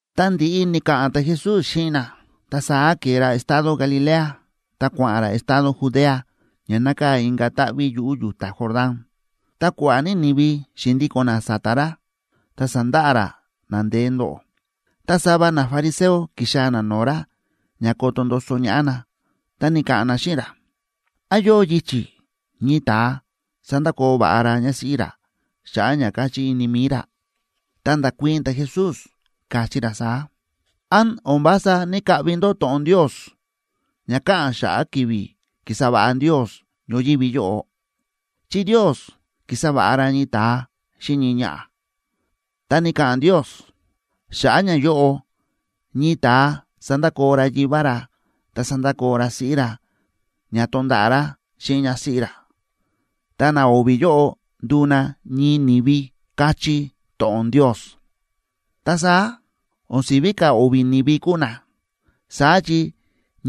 Ta ndi̱ꞌi ni̱ka̱ꞌa̱n ta̱Jesús xíꞌin na, ta saá ke̱e ra estado Galilea ta kua̱ꞌa̱n ra estado Judea ña nákaa̱ inka̱ táꞌví yuꞌu̱ yu̱ta Jordán. Ta kua̱ꞌa̱ ní ni̱vi xi̱ndíko̱n na sa̱ta̱ ra, ta sa̱ndaꞌa ra na ndeé ndóꞌo. Ta sava nafariseo ki̱xaa̱ na no̱o̱ ra ña koto ndoso ñaꞌá na, ta ni̱ka̱ꞌa̱n na xíꞌin ra: ―¿Án yóo yichi̱ ñii ta̱a sandakoo va̱ꞌa ra ñásíꞌí ra xa̱ꞌa̱ ña káchí ini mi̱i ra? Ta nda̱kuii̱n ta̱Jesús, káchí ra saá: ―¿Án o̱n vása ní‑kaꞌvi ndó to̱ꞌon Ndios ña káꞌa̱n xa̱ꞌa̱ ki̱vi̱ ki̱sa va̱ꞌa Ndios ñoyívi yóꞌo? Chi Ndios ki̱sa va̱ꞌa ra ñii ta̱a xíꞌin ñii ñaꞌa̱. Ta ni̱ka̱ꞌa̱n Ndios: “Xa̱ꞌa̱ ñayóꞌo ñii ta̱a sandakoo ra yivá ra ta sandakoo ra siꞌí ra ña tonda̱ꞌa̱ ra xíꞌin ñásíꞌí ra, ta na o̱vi̱ yóꞌo nduu na ñii ni̱vi”, káchí to̱ꞌon Ndios. Ta saá, o̱n si̱ví ka̱ o̱vi̱ ni̱vi kúu na, saá chi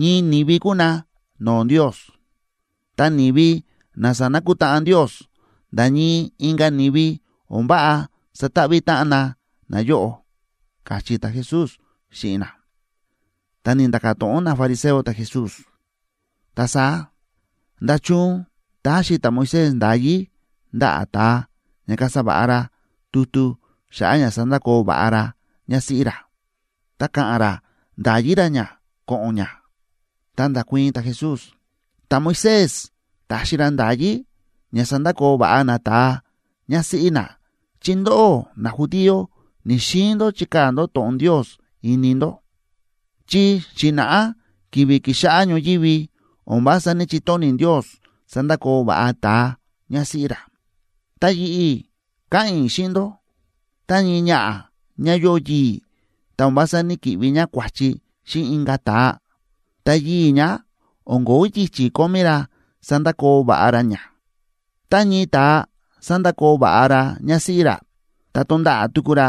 ñii ni̱vi kúu na no̱o̱ Ndios. Ta ni̱vi na sa̱nakutáꞌan Ndios, nda̱ ñii inka̱ ni̱vi o̱n váꞌa sataꞌví táꞌan na nayóꞌo ―káchí ta̱Jesús xíꞌin na. Ta ni̱nda̱ka̱ to̱ꞌon nafariseo ta̱Jesús: ―Ta saá, ¿nda̱chun ta̱xi ta̱Moisés nda̱yí ndaꞌa̱ ta̱a ña kasa va̱ꞌa ra tutu xa̱ꞌa̱ ña sandakoo va̱ꞌa ra ñásíꞌí ra, ta ka̱ꞌa̱n ra nda̱yi ra ñá ko̱ꞌo̱n ñá? Ta nda̱kuii̱n ta̱Jesús: ―Ta̱Moisés ta̱xi ra nda̱yí ña sandakoo va̱ꞌa nata̱a ñásíꞌí na chi ndóꞌó najudío ni̱‑xiin ndó chikaa̱ ndó to̱ꞌon Ndios ini ndó. Chi xi̱na̱ꞌá ki̱vi̱ ki̱xáꞌá ñoyívi o̱n vása ní‑chitóni̱ Ndios sandakoo va̱ꞌa ta̱a ñásíꞌí ra. Ta yi̱ꞌi̱ káꞌa̱n i̱ xíꞌin ndó, tá ñii ñaꞌa̱ ñá yóo yii̱ ta o̱n vása ní‑kiꞌvi ñá kua̱chi xíꞌin inka̱ ta̱a, ta yii̱ ñá o̱n ko̱ó yichi̱ kómí ra sandakoo va̱ꞌa ra ñá. Tá ñii ta̱a sandakoo va̱ꞌa ra ñásíꞌí ra, ta tonda̱ꞌa̱ tuku ra,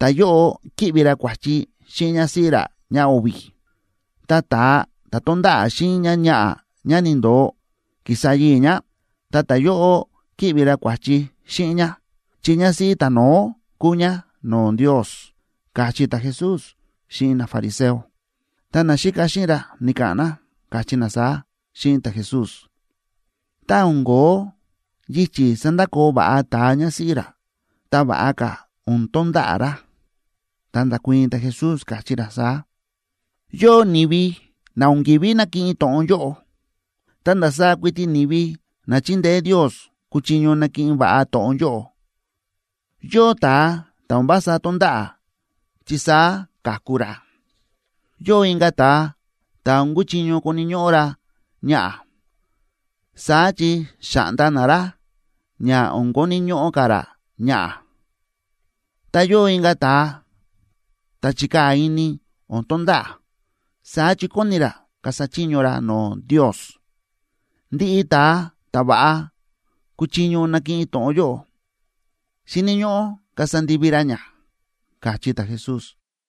ta̱yóꞌo ki̱ꞌvi ra kua̱chi xíꞌin ñásíꞌí ra ñáo̱vi̱. Ta ta̱a ta̱ tonda̱ꞌa̱ xíꞌin ñáñaꞌa̱ ñá ni̱ndo̱o, ki̱sa yii̱ ñá, ta ta̱yóꞌo ki̱ꞌvi ra kua̱chi xíꞌin ñá, chi ñásíꞌí ta̱no̱ó kúu ñá no̱o̱ Ndios ―káchí ta̱Jesús xíꞌin nafariseo. Ta naxíka xíꞌin ra ni̱ka̱ꞌa̱n na, káchí na saá xíꞌin ta̱Jesús: ―Tá o̱n ko̱ó yichi̱ sandakoo va̱ꞌa ta̱a ñásíꞌí ra, ta va̱ꞌa ka̱ o̱n tonda̱ꞌa̱ ra. Ta nda̱kuii̱n ta̱Jesús, káchí ra saá: ―Yóo ni̱vi na o̱n ki̱ví nakiꞌin to̱ꞌon yóꞌo. Ta ndasaá kuiti ni̱vi na chindeé Ndios kuchiño nakiꞌin va̱ꞌa to̱ꞌon yóꞌo. Yóo ta̱a ta̱ o̱n vása tónda̱ꞌa̱ chi saá ka̱ku ra. Yóo inka̱ ta̱a ta̱ o̱n kuchiño koni̱ ñóꞌó ra ñaꞌa̱, saá chi xa̱ꞌnda na ra ña o̱n koni̱ ñóꞌó ka̱ ra ñaꞌa̱. Ta yóo inka̱ ta̱a ta̱ chíkaa̱ ini o̱n tonda̱ꞌa̱, saá chi kóni ra kasa chiño ra no̱o̱ Ndios. Ndiꞌi ta̱a ta̱ va̱ꞌa kúchiño nakiꞌin to̱ꞌon yóꞌo, xíni̱ ñóꞌó kasa ndivi ra ña ―káchí ta̱Jesús.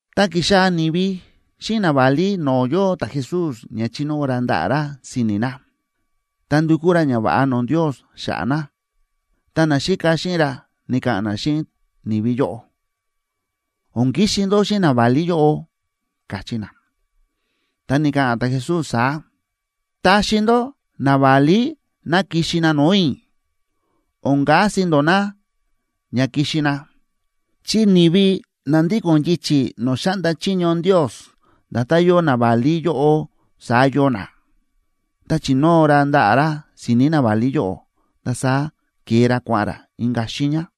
Ta ki̱xaa̱ ni̱vi xíꞌin naválí no̱o̱ yóo ta̱Jesús ña chinóo ra ndaꞌa̱ ra si̱ni̱ na, ta ndukú ra ñava̱ꞌa no̱o̱ Ndios xa̱ꞌa̱ na. Ta naxíka xíꞌin ra ni̱ka̱ꞌa̱n na xíꞌin ni̱vi yóꞌo: ―O̱n kixi ndó xíꞌin naválí yóꞌo ―káchí na. Ta ni̱ka̱ꞌa̱n ta̱Jesús saá: ―Taxi ndó naválí ná kixi na no̱o̱ i̱, o̱n kasi ndó no̱o̱ na ña kixi na, chi ni̱vi na ndíko̱n yichi̱ no̱o̱ xáꞌnda chiño Ndios, nda̱tán yóo naválí yóꞌo, saá yóo na. Ta chi̱nóo ra ndaꞌa̱ ra si̱ni̱ naválí yóꞌo, ta saá ke̱e ra kua̱ꞌa̱n ra inka̱ xiiña.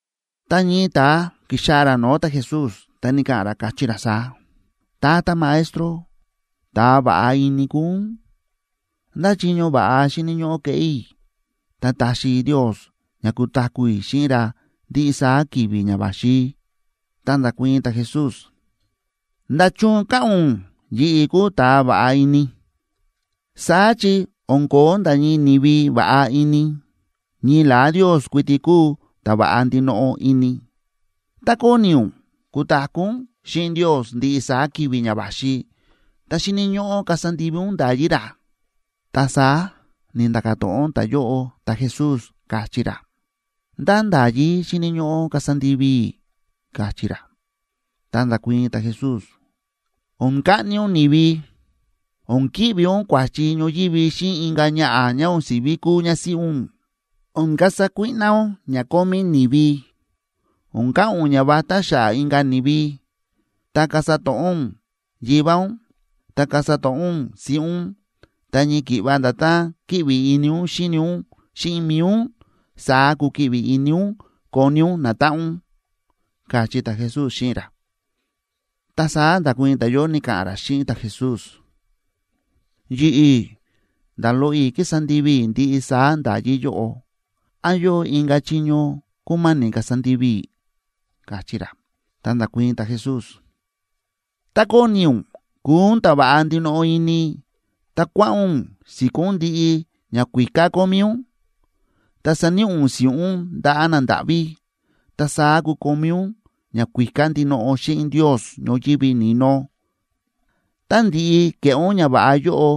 Ta ñii ta̱a ki̱xaa̱ ra no̱o̱ ta̱Jesús, ta ni̱ka̱ꞌa̱n ra, káchí ra saá: ―Tata Maestro, ta̱a va̱ꞌa ini kúu ún, ¿ndá chiño va̱ꞌa xíni̱ ñóꞌó keꞌé i̱, ta taxi Ndios ña kutaku̱ i̱ xíꞌin ra ndiꞌi saá ki̱vi̱ ña va̱xi? Ta nda̱kuii̱n ta̱Jesús: ―¿Nda̱chun káꞌa̱n ún yi̱ꞌi̱ kúu ta̱a va̱ꞌa ini? Saá chi o̱n ko̱ó nda̱ ñii ni̱vi va̱ꞌa ini, ñii la̱á Ndios kuiti kúu ta̱ va̱ꞌa ndinoꞌo ini. Tá kóni ún kutaku̱ ún xíꞌin Ndios ndiꞌi saá ki̱vi̱ ña va̱xi, ta xíni̱ ñóꞌó kasa ndivi ún nda̱yí ra. Ta saá ni̱nda̱ka̱ to̱ꞌon ta̱yóꞌo ta̱Jesús, káchí ra: ―¿Ndá nda̱yí xíni̱ ñóꞌó kasa ndivi i̱? ―káchí ra. Ta nda̱kuii̱n ta̱Jesús; ―O̱n kaꞌni ún ni̱vi, o̱n ki̱ꞌvi ún kua̱chi ñoyívi xíꞌin inka̱ ñaꞌa̱ ñá o̱n si̱ví kúu ñásíꞌí ún, o̱n kasa kuíꞌná ún ña kómí ni̱vi, o̱n ka̱ꞌa̱n ún ñavatá xa̱ꞌa̱ inka̱ ni̱vi, ta kasa to̱ꞌó ún yivá ún, ta kasa to̱ꞌó ún siꞌí ún, ta ñii ki̱ꞌva nda̱tán kíꞌvi ini ún xíni ún xíꞌin mi̱i ún, saá kukiꞌvi ini ún koni ún natáꞌan ún ―káchí ta̱Jesús xíꞌin ra. Ta saá nda̱kuii̱n ta̱yóꞌo, ni̱ka̱ꞌa̱n ra xíꞌin ta̱Jesús: ―Yi̱ꞌi̱ nda̱ loꞌo i̱ kísa ndivi i̱ ndiꞌi saá nda̱yí yóꞌo. ¿Án yóo inka̱ chiño kúma̱ni̱ kasa ndivi i̱? ―káchí ra. Ta nda̱kuii̱n ta̱Jesús: ―Tá kóni ún kuu ún ta̱ va̱ꞌa ndinoꞌo ini, ta kua̱ꞌa̱n ún si̱kó ún ndiꞌi ñakuíká kómí ún, ta saníꞌi ún si̱ꞌún ndaꞌa̱ nandáꞌví. Ta saá kukomí ún ñakuíká ndinoꞌo xíꞌin Ndios ñoyívi ni̱no. Tá ndi̱ꞌi ke̱ꞌé ún ñava̱ꞌa yóꞌo,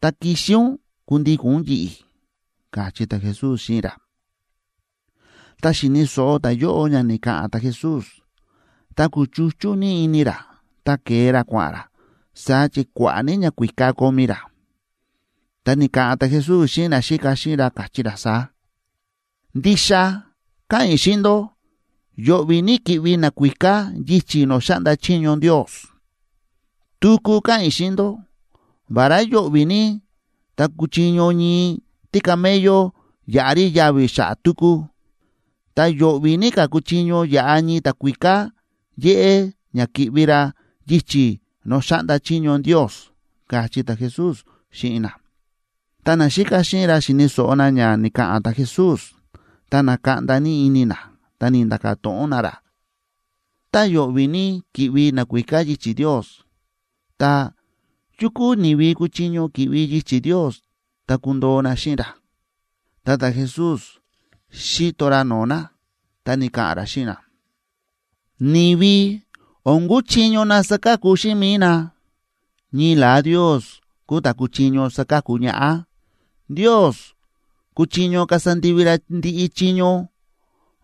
ta kixi ún kundíko̱n ún yi̱ꞌi̱ ―káchí ta̱Jesús xíꞌin ra. Ta xi̱ni̱ so̱ꞌo ta̱yóꞌo ña ni̱ka̱ꞌa̱n ta̱Jesús, ta kúchuchú ní ini ra, ta ke̱e ra kua̱ꞌa̱n ra, saá chi kua̱ꞌa̱ ní ñakuíká kómí ra. Ta ni̱ka̱ꞌa̱n ta̱Jesús xíꞌin naxíka xíꞌin ra, káchí ra saá: ―Ndixa káꞌa̱n i̱ xíꞌin ndó, yo̱ꞌvi̱ ní ki̱ꞌvi nakuíká yichi̱ no̱o̱ xáꞌnda chiño Ndios. Tuku káꞌa̱n i̱ xíꞌin ndó, vará yo̱ꞌvi̱ ní tá kuchiño ñii tícamello yaꞌa rí yavi̱ xa̱ꞌa̱ túkú, ta yo̱ꞌvi̱ ní ka̱ kuchiño yaꞌa ñii ta̱kuíká yéꞌé ña ki̱ꞌvi ra yichi̱ no̱o̱ xáꞌnda chiño Ndios ―káchí ta̱Jesús xíꞌin na. Ta naxíka xíꞌin ra xi̱ni̱ so̱ꞌo na ña ni̱ka̱ꞌa̱n ta̱Jesús, ta na̱kaꞌnda ní ini na, ta ni̱nda̱ka̱ to̱ꞌon na ra: ―Tá yo̱ꞌvi̱ ní ki̱ꞌvi nakuíká yichi̱ Ndios, ta, ¿yu kúu ni̱vi kuchiño ki̱ꞌvi yichi̱ Ndios ta kundoo na xíꞌin ra? Ta ta̱Jesús xi̱to ra no̱o̱ na, ta ni̱ka̱ꞌa̱n ra xíꞌin na: ―Ni̱vi o̱n kúchiño na saka̱ku xíꞌin mi̱i na, ñii la̱á Ndios kúu ta̱ kúchiño saka̱ku ñaꞌá. Ndios kúchiño kasa ndivi ra ndiꞌi chiño.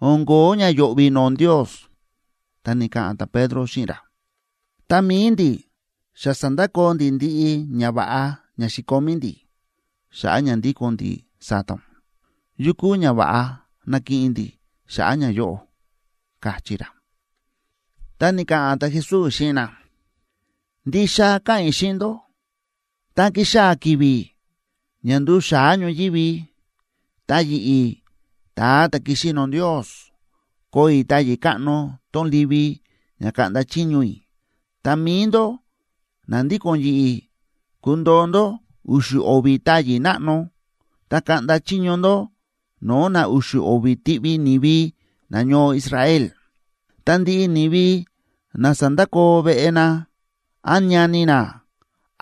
O̱n ko̱ó ña yo̱ꞌvi̱ no̱o̱ Ndios. Ta ni̱ka̱ꞌa̱n ta̱Pedro xíꞌin ra: ―Ta mi̱i ndi̱, xa sa̱ndakoo ndi̱ ndiꞌi ñava̱ꞌa ña xi̱komí ndi̱, xa̱ꞌa̱ ña ndíko̱n ndi̱ sa̱ta̱ ún. ¿Yu kúu ñava̱ꞌa nakiꞌin ndi̱ xa̱ꞌa̱ ñayóꞌo? ―káchí ra. Ta ni̱ka̱ꞌa̱n ta̱Jesús xíꞌin na: ―Ndixa káꞌa̱n i̱ xíꞌin ndó, tá ki̱xaa̱ ki̱vi̱ ña nduu xa̱á ñoyívi, ta yi̱ꞌi̱, ta̱a ta̱ ki̱xi no̱o̱ Ndios, koo i̱ táyi̱ káꞌno tón livi ña kaꞌnda chiño i̱, ta mi̱i ndó na ndíko̱n yi̱ꞌi̱ kundoo ndó u̱xu̱ o̱vi̱ táyi̱ náꞌno, ta kaꞌnda chiño ndó no̱o̱ na u̱xu̱ o̱vi̱ tiꞌvi ni̱vi nañoo Israel. Ta ndiꞌi ni̱vi na sa̱ndakoo veꞌe na, án ñani na,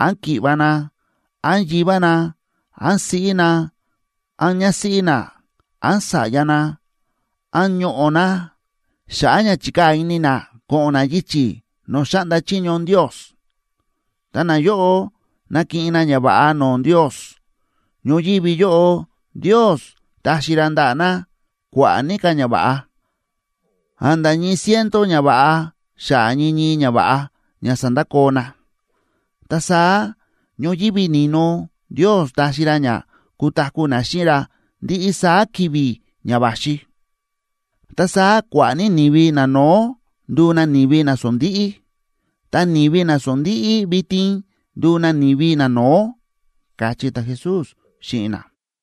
án ki̱ꞌva̱ na, án yivá na, án siꞌí na, án ñásíꞌí na, án sa̱ꞌya na, án ñoꞌo̱ na, xa̱ꞌa̱ ña chi̱kaa̱ ini na ko̱ꞌo̱n na yichi̱ no̱o̱ xáꞌnda chiño Ndios, ta nayóꞌo nakiꞌin na ñava̱ꞌa no̱o̱ Ndios. Ñoyívi yóꞌo Ndios taxi ra ndaꞌa̱ na kua̱ꞌa̱ ní ka̱ ñava̱ꞌa, a̱nda̱ ñii ciento ñava̱ꞌa xa̱ꞌa̱ ñii ñii ñava̱ꞌa ña sa̱ndakoo na. Ta saá ñoyívi ni̱no Ndios taxi ra ña kutaku̱ na xíꞌin ra ndiꞌi saá ki̱vi̱ ña va̱xi. Ta saá kua̱ꞌa̱ ní ni̱vi nano̱ó nduu na ni̱vi nasondíꞌí, ta ni̱vi nasondíꞌí vitin nduu na ni̱vi nano̱ó ―káchí ta̱Jesús xíꞌin na.